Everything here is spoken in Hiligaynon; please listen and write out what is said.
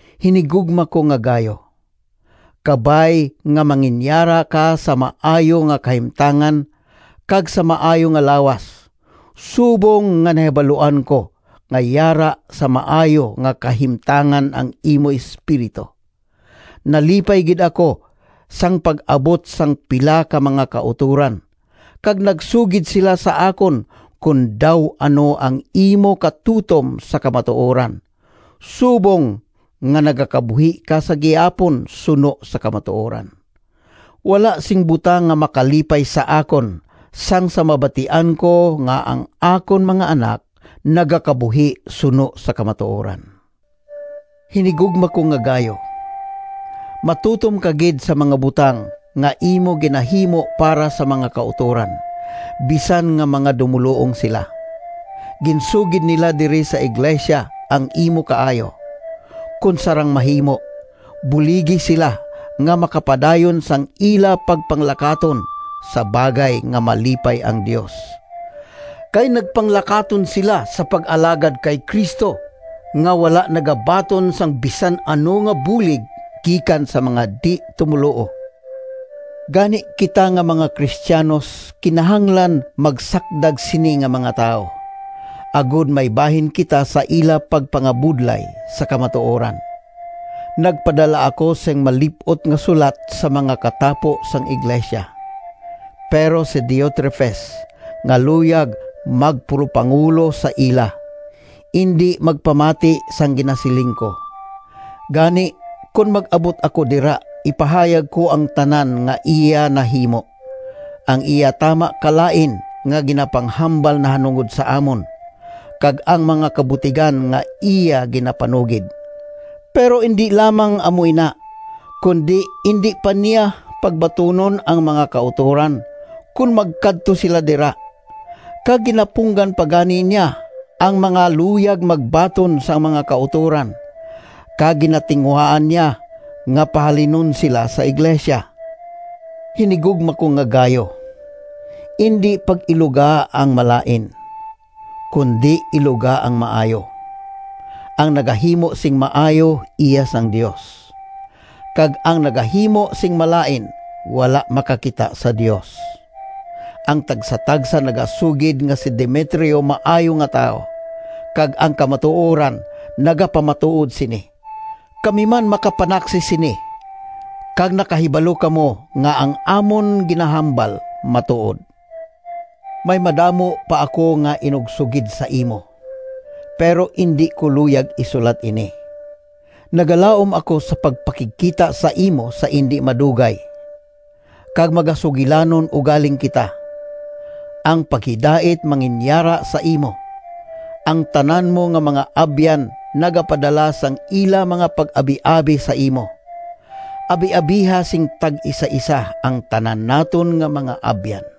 Hinigugma ko nga Gayo, kabay nga manginyara ka sa maayo nga kahimtangan kag sa maayo nga lawas, subong nga nahibaluan ko nga yara sa maayo nga kahimtangan ang imo espiritu. Nalipay gid ako sang pag-abot sang pila ka mga kautoran, kag nagsugid sila sa akon kon daw ano ang imo katutom sa kamatuoran, subong nga nagakabuhi ka sa gihapon suno sa kamatuoran. Wala sing butang nga makalipay sa akon sang sa mabatian ko nga ang akon mga anak nagakabuhi suno sa kamatuoran. Hinigugma ko nga Gayo, matutom ka gid sa mga butang nga imo ginahimo para sa mga kautoran, bisan nga mga dumoluong sila. Ginsugid nila diri sa iglesia ang imo kaayo. Kon sarang mahimo, buligi sila nga makapadayon sang ila pagpanglakaton sa bagay nga malipay ang Dios. Kay nagpanglakaton sila sa pag-alagad kay Cristo, nga wala nagabaton sang bisan ano nga bulig gikan sa mga di-tumoluo. Gani kita nga mga Cristianos kinahanglan magsakdag sini nga mga tawo, agod may bahin kita sa ila pagpangabudlay sa kamatuoran. Nagpadala ako sing malip-ot nga sulat sa mga katapo sang iglesia. Pero si Diotrefes nga luyag magpulopangulo sa ila, indi magpamati sang ginasiling ko. Gani kon mag-abot ako dira ipahayag ko ang tanan nga iya nahimo: ang iya tama kalain nga ginapanghambal nahanungod sa amon, kag ang mga kabutigan nga iya ginapanugid. Pero indi lamang amo ina, kundi indi pa niya pagbatunon ang mga kautoran kon magkadto sila dira, kag ginapunggan pa gani niya ang mga luyag magbaton sang mga kautoran, kag ginatinguhaan niya nga pahalinon sila sa iglesia! Hinigugma ko nga Gayo, indi pag-iluga ang malain, kundi iluga ang maayo. Ang nagahimo sing maayo iya sang Dios, kag ang nagahimo sing malain wala makakita sa Dios. Ang tagsatagsa nagasugid nga si Demetrio maayo nga tawo, kag ang kamatuoran nagapamatuod sini. Kami man makapanaksi sini kag nakahibalo kamo nga ang amon ginahambal matuod. May madamo pa ako nga inugsugid sa imo, pero indi ko luyag isulat ini. Nagalaom ako sa pagpakigkita sa imo sa indi madugay, kag magasugilanon ugaling kita. Ang paghidait manginyara sa imo. Ang tanan mo nga mga abyan nagapadala sang ila mga pag-abiabi sa imo. Abiabiha sing tag-isaisa ang tanan naton nga mga abyan.